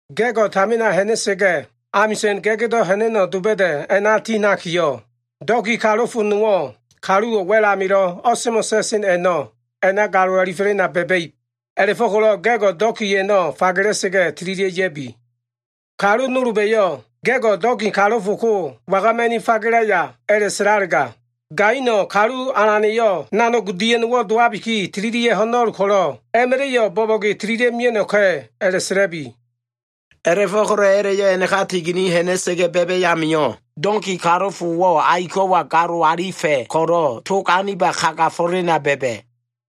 “Ga꞉go꞉ tamina ha꞉na꞉sa꞉ga꞉, amisa꞉n ga꞉gdo꞉ ha꞉na꞉no꞉ doba꞉da꞉ a꞉na ti ha꞉nakiyo꞉, donki kalofo nowo꞉, kaluwo꞉ wa꞉l a꞉namilo꞉ o꞉semo꞉ sa꞉sen a꞉no꞉ a꞉na galo alifo꞉lena ba꞉ba꞉ib. A꞉la꞉fo꞉ko꞉lo꞉ ga꞉go꞉ donki a꞉no꞉ fagela꞉sa꞉ga꞉, tililia꞉ ya꞉bi. Kalu nolba꞉yo꞉ ‘Ga꞉go꞉ donki kalofo ko wagama꞉ni fagelaya?’ a꞉la꞉sa꞉lalega, gaino꞉ ‘Kalu alana꞉yo꞉ nanog dia꞉no꞉wo꞉ dowabiki tililia꞉ ho꞉no꞉l ko꞉lo꞉, a꞉ma꞉la꞉yo꞉ bo꞉bo꞉ge tililia꞉ mia꞉no꞉ka꞉’ a꞉la꞉sa꞉la꞉bi.” A꞉la꞉fo꞉ko꞉lo꞉ a꞉la꞉yo꞉ a꞉naka tigini ha꞉na꞉sa꞉ga꞉ ba꞉ba꞉ amio꞉, donki kalofowo꞉ aiko꞉wa galolo꞉ alifa꞉ ko꞉lo꞉, tog aniba kagafo꞉lena ba꞉ba꞉.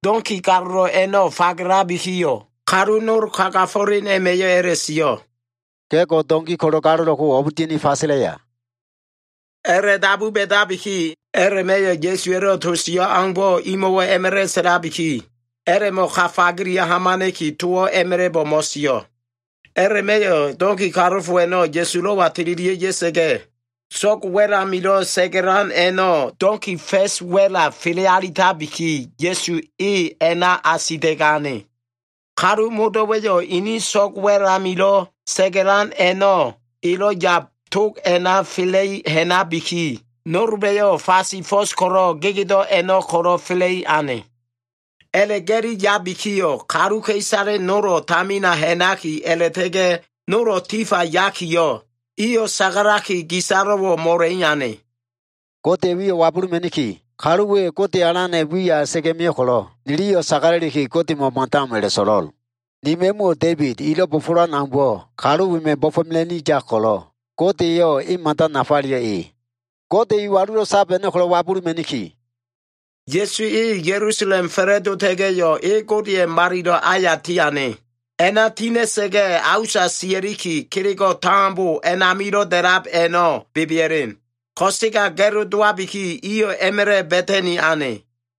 Donki galolo꞉ a꞉no꞉ fagelabikiyo꞉, kalu nol kagafo꞉len a꞉ma꞉yo꞉ a꞉la꞉sio꞉, “Ga꞉go꞉, donki ko꞉lo꞉ galolo꞉ ko o꞉b dia꞉ni fagelaya?” A꞉la꞉dabu ba꞉dabiki, a꞉la꞉ma꞉yo꞉ Ya꞉suwa꞉lo꞉ sio꞉ aumbo꞉ imo꞉wo꞉ a꞉ma꞉la꞉ sa꞉labiki, a꞉la꞉mo꞉ ka fagelia꞉ hamana꞉ki, towo꞉ a꞉ma꞉la꞉bo꞉ mo꞉sio꞉. A꞉la꞉ma꞉yo꞉ donki kalofo a꞉no꞉ Ya꞉sulo꞉wa tililia꞉ ya꞉sa꞉ga꞉, so꞉g wa꞉l amilo꞉ sa꞉ga꞉lan a꞉no꞉ donki fa꞉sa꞉ wa꞉la fele alitabiki, Ya꞉su e a꞉na asita꞉ga꞉ ane. Kalu modo꞉wa꞉yo꞉ ini so꞉g wa꞉l amilo꞉ sa꞉ga꞉lan a꞉no꞉ elo꞉ yab tog a꞉na fela꞉li ha꞉nabiki, nolba꞉yo꞉ fasi fo꞉s ko꞉lo꞉ gegedo꞉ a꞉no꞉ ko꞉lo꞉ fela꞉i ane. A꞉la꞉ga꞉li yabikiyo꞉, kaluka꞉isale nolo꞉ tamina ha꞉naki a꞉la꞉ta꞉ga꞉ nolo꞉ tifa yakiyo꞉, iyo꞉ sagalaki gisalo꞉wo꞉ mo꞉la꞉i ane. “Godeya꞉ wiyo꞉ wabuluma꞉niki. Kalu we, Gode Alana꞉ wiya a꞉la꞉ta꞉ga꞉ mio꞉ ko꞉lo꞉, niliyo꞉ sagala꞉liki, Godemo꞉ mada o꞉m a꞉la꞉so꞉lo꞉l. Ni ma꞉muwo꞉ Da꞉ibid elo꞉ bo꞉fo꞉lowan aumbo꞉, kalu wema꞉ bo꞉fo꞉mela꞉ni yab ko꞉lo꞉, Godeyo꞉ e mada nafaleyo꞉ e. Gode iwalulo꞉ sab a꞉no꞉ ko꞉lo꞉ wabuluma꞉niki.” Ya꞉su e Ya꞉lusalem fa꞉la꞉dota꞉ga꞉yo꞉, e Godeya꞉ Malilo꞉ aya tiane. A꞉na tina꞉sa꞉ga꞉, a usa sia꞉liki, kelego꞉ tambo a꞉namilo꞉ da꞉lab a꞉no꞉ bebea꞉len. Ko꞉sega ga꞉lo dowabiki, iyo꞉ a꞉ma꞉la꞉ Ba꞉tani ane.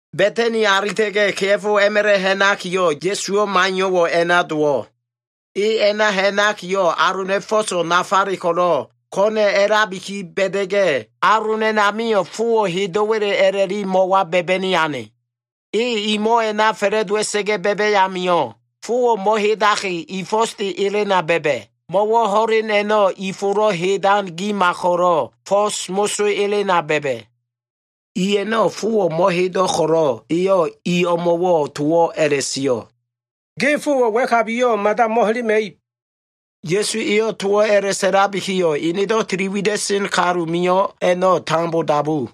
Ba꞉tani alita꞉ga꞉, kea꞉fo a꞉ma꞉la꞉ ha꞉nakiyo꞉, Ya꞉suwo꞉ maiyo꞉wo꞉ a꞉na dowo꞉. E a꞉na ha꞉nakiyo꞉, alona꞉ i fo꞉so꞉ nafale ko꞉lo꞉ ko꞉na꞉ a꞉labiki ba꞉da꞉ga꞉, alon a꞉namio꞉ fowo꞉ hedo꞉wa꞉le a꞉la꞉li mo꞉wa ba꞉ba꞉ni ane. E i mo꞉ a꞉na fa꞉la꞉dowa꞉sa꞉ga꞉ ba꞉ba꞉ amio꞉, fowo꞉ mo꞉hedaki, i fo꞉sde elena ba꞉ba꞉, mo꞉wo꞉ ho꞉len a꞉no꞉ i folo꞉ hedan gima ko꞉lo꞉ fo꞉s moso ba꞉ba꞉. I a꞉no꞉ fowo꞉ mo꞉hedo꞉ ko꞉lo꞉, eyo꞉ i o꞉mo꞉wo꞉ towo꞉ a꞉la꞉sio꞉, “Ge fowo꞉ wa꞉kabiyo꞉ mada mo꞉helema꞉ib.” Ya꞉su eyo꞉ towo꞉ a꞉la꞉sa꞉labikiyo꞉, enedo꞉ tili wida꞉sen kalu mio꞉ a꞉no꞉ tambo dabu.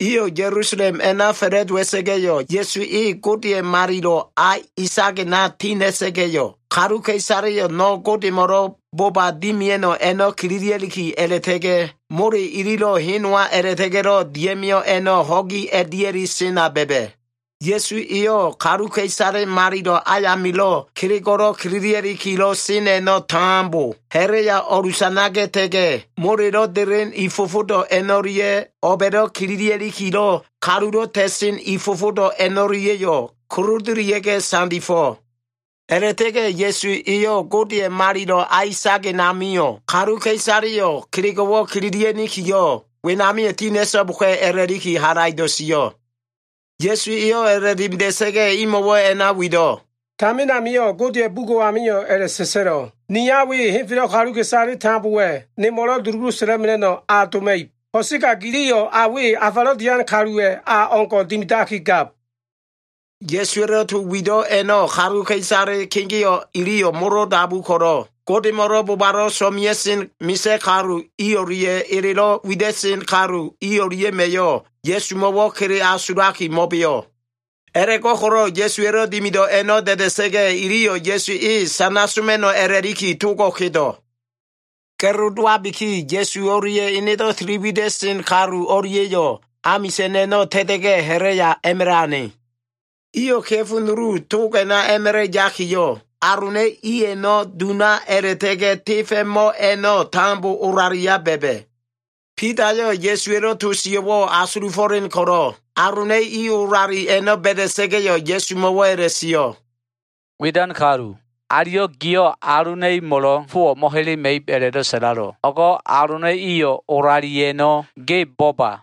Iyo꞉ Ya꞉lusalem a꞉na fa꞉la꞉dowa꞉sa꞉ga꞉yo꞉, Ya꞉su e Godeya꞉ Malilo꞉ a isagena ti ha꞉na꞉ga꞉yo꞉, kaluka꞉isaleyo꞉ no꞉ Godemo꞉lo꞉ boba dimia꞉no꞉ a꞉no꞉ kililia꞉liki a꞉la꞉ta꞉ga꞉, mole ililo꞉ hen nowa a꞉la꞉ta꞉ga꞉lo꞉ dia꞉mio꞉ a꞉no꞉ ho꞉gi a꞉dia꞉li sena ba꞉ba꞉. Ya꞉su eyo꞉ kaluka꞉isale malilo꞉ ayamilo꞉ kelego꞉lo꞉ kililia꞉likilo꞉ sen a꞉no꞉ tambo ha꞉la꞉ya o꞉lusanaga꞉ta꞉ga꞉, molelo꞉ delen i fofodo꞉ a꞉no꞉lia꞉, o꞉ba꞉lo꞉ kililia꞉likilo꞉ kalulo꞉ ta꞉sen i fofodo꞉ a꞉no꞉lia꞉yo꞉ kolodolia꞉ga꞉ sandifo꞉. A꞉la꞉ta꞉ga꞉ Ya꞉su eyo꞉ Godeya꞉ alilo꞉ a isagen amio꞉ kaluka꞉isaleyo꞉ kelego꞉ kililia꞉nikiyo꞉, wenamio꞉ tinia꞉so꞉boka꞉ a꞉la꞉liki halaido꞉ sio꞉. Ya꞉su eyo꞉ a꞉la꞉dimida꞉sa꞉ga꞉, imo꞉wo꞉ a꞉na wido꞉, “Tamin amio꞉ Godeya꞉ bugo꞉ amio꞉ a꞉la꞉sa꞉sa꞉lo꞉, “ ‘Ni a we henfelo꞉ kaluka꞉isale tambowa꞉ nemo꞉lo꞉ dulugu sa꞉la꞉mela꞉no꞉ a doma꞉ib. Ko꞉sega giliyo꞉ a we afalo꞉ dian kaluwa꞉ a o꞉ngo꞉ dimidakigab.’” Ya꞉suwa꞉lo꞉ to wido꞉ a꞉no꞉ kaluka꞉isale kegeo꞉ iliyo꞉ molo dabu ko꞉lo꞉, Godemo꞉lo꞉ bobalo꞉ so꞉mea꞉sen misa꞉ kalu i o꞉lia꞉ elelo꞉ wida꞉sen kalu i o꞉lia꞉ma꞉yo꞉ Ya꞉sumo꞉wo꞉ kele asulaki mo꞉beo꞉. A꞉la꞉fo꞉ko꞉lo꞉ Ya꞉suwa꞉lo꞉ dimido꞉ a꞉no꞉ da꞉da꞉sa꞉ga꞉, iliyo꞉ Ya꞉su e sana soma꞉no꞉ a꞉la꞉liki togo꞉ kedo꞉. Ga꞉lo dowabiki, Ya꞉su o꞉lia꞉ enedo꞉ tili wida꞉sen kalu o꞉lia꞉yo꞉ amisa꞉n a꞉no꞉ ta꞉ta꞉ga꞉, ha꞉la꞉ya a꞉ma꞉la꞉ ane. Iyo꞉ kea꞉fo nulu tog a꞉na a꞉ma꞉la꞉ yakiyo꞉, alona꞉ i a꞉no꞉ duna a꞉la꞉ta꞉ga꞉ tefa꞉ mo꞉ a꞉no꞉ tambo o꞉lalia ba꞉ba꞉. Bidayo꞉ Ya꞉suwa꞉lo꞉ to sio꞉wo꞉ asulufo꞉len ko꞉lo꞉, alona꞉ i olali a꞉no꞉ ba꞉da꞉sa꞉ga꞉yo꞉, Ya꞉sumo꞉wo꞉ a꞉la꞉sio꞉, “Widan kalu, aliyo꞉ giyo꞉ alona꞉ imo꞉lo꞉ fowo꞉ mo꞉helema꞉ib a꞉la꞉do꞉ sa꞉lalo꞉, o꞉go꞉ alona꞉ iyo꞉ olali a꞉no꞉ ge bo꞉ba.”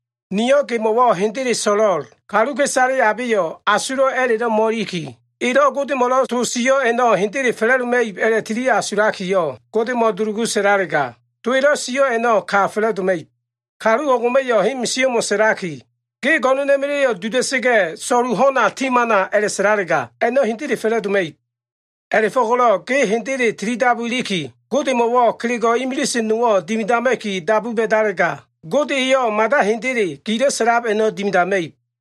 Niyo꞉ gemo꞉wo꞉ hendele so꞉lo꞉l. Kaluka꞉isale abeyo꞉ asulo꞉ a꞉la꞉lo꞉ mo꞉iliki, elo꞉ Godemo꞉lo꞉ to sio꞉ a꞉no꞉ hendele fa꞉la꞉doma꞉ib a꞉la꞉tili asulakiyo꞉ Godemo꞉ dulugu sa꞉lalega, to elo꞉ sio꞉ a꞉no꞉ ka hendele fa꞉la꞉doma꞉ib. Kalu o꞉ngo꞉ma꞉yo꞉ hen misio꞉mo꞉ sa꞉laki, ‘Ge go꞉no꞉na꞉ma꞉la꞉yo꞉ duda꞉sa꞉ga꞉, so꞉lu ho꞉na ti hamana’ a꞉la꞉sa꞉lalega, a꞉no꞉ hendele fa꞉la꞉doma꞉ib. A꞉la꞉fo꞉ko꞉lo꞉ ge hendele tilidabu iliki, Godemo꞉wo꞉ kelego꞉ imilise nowo꞉ dimidama꞉ki dabu ba꞉dalega, Gode eyo꞉ mada hendele gilo꞉ sa꞉lab a꞉no꞉ dimidama꞉ib.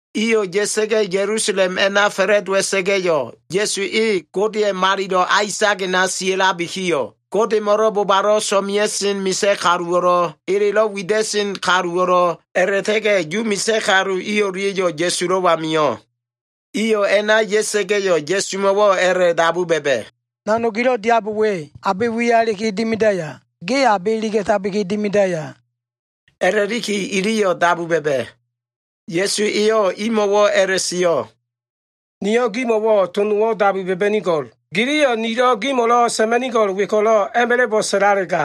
Iyo꞉ ya꞉sa꞉ga꞉ Ya꞉lusalem a꞉na fa꞉la꞉dowa꞉sa꞉ga꞉yo꞉, Ya꞉su e Godeya꞉ Malilo꞉ a isagena sia꞉labikiyo꞉, Godemo꞉lo꞉ bobalo꞉ so꞉mea꞉sen misa꞉ kaluwo꞉lo꞉, elelo꞉ wida꞉sen kaluwo꞉lo꞉, a꞉la꞉ta꞉ga꞉ Yu misa꞉ kalu i o꞉lia꞉yo꞉ Ya꞉sulo꞉wa mio꞉. Iyo꞉ a꞉na ya꞉sa꞉ga꞉yo꞉, Ya꞉sumo꞉wo꞉ a꞉la꞉dabu ba꞉ba꞉, “Nanog gilo꞉ diab we, abe wiya iliki dimidaya? Ge abe iliga꞉tabi dimidaya?” a꞉la꞉liki iliyo꞉ dabu ba꞉ba꞉. Ya꞉su eyo꞉ imo꞉wo꞉ a꞉la꞉sio꞉, “Niyo꞉ gimo꞉wo꞉ to nowo꞉ dabu ba꞉ba꞉nigo꞉l. Giliyo꞉ nilo꞉ gimo꞉lo꞉ sa꞉ma꞉nigo꞉l we ko꞉lo꞉ a꞉ma꞉la꞉bo꞉ sa꞉lalega,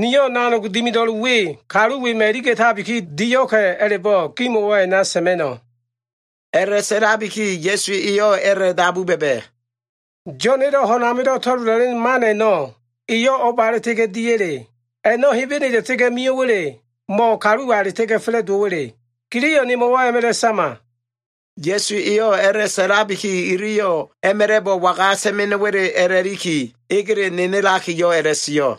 niyo꞉ nanog dimido꞉l we, kalu wema꞉ iliga꞉tabi dio꞉ka꞉ a꞉la꞉bo꞉, gimo꞉wo꞉ a꞉na sa꞉ma꞉no꞉.” A꞉la꞉sa꞉labiki Ya꞉su eyo꞉ a꞉la꞉dabu ba꞉ba꞉, “Yo꞉na꞉lo꞉ ho꞉n amilo꞉ to꞉lola꞉len man a꞉no꞉, eyo꞉ o꞉ba a꞉la꞉ta꞉ga꞉ diya꞉le? A꞉no꞉ Hebene a꞉la꞉ta꞉ga꞉ mio꞉wa꞉le, mo꞉ kaluwa a꞉la꞉ta꞉ga꞉ fa꞉la꞉dowo꞉wa꞉le? Giliyo꞉ nemo꞉wo꞉ a꞉ma꞉la꞉ sama.” Ya꞉su eyo꞉ a꞉la꞉sa꞉labiki, iliyo꞉ a꞉ma꞉la꞉bo꞉ waga sa꞉ma꞉no꞉wa꞉le a꞉la꞉liki egele nenelakiyo꞉ a꞉la꞉sio꞉.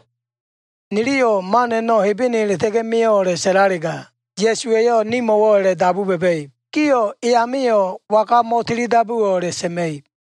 “Niliyo꞉ ‘Man a꞉no꞉ Hebene a꞉la꞉ta꞉ga꞉ mio꞉’ a꞉la꞉sa꞉lalega, Ya꞉suwa꞉yo꞉ nimo꞉wo꞉ a꞉la꞉dabu ba꞉ba꞉ib, ‘Gio꞉ e amio꞉ waga mo꞉tili dabuwo꞉?’ a꞉la꞉sa꞉ma꞉ib.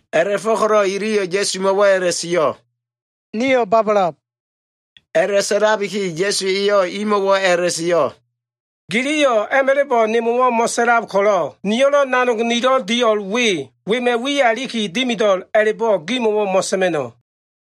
A꞉la꞉fo꞉ko꞉lo꞉ iliyo꞉ Ya꞉sumo꞉wo꞉ a꞉la꞉sio꞉, “Nio꞉ babalab.” A꞉la꞉sa꞉labiki Ya꞉su eyo꞉ imo꞉wo꞉ a꞉la꞉sio꞉, “Giliyo꞉ a꞉ma꞉la꞉bo꞉ nemo꞉wo꞉ mo꞉sa꞉lab ko꞉lo꞉, niyo꞉lo꞉ nanog nilo꞉ dio꞉l we, wema꞉ wiya iliki dimido꞉l a꞉la꞉bo꞉ gimo꞉wo꞉ mo꞉sa꞉ma꞉no꞉.”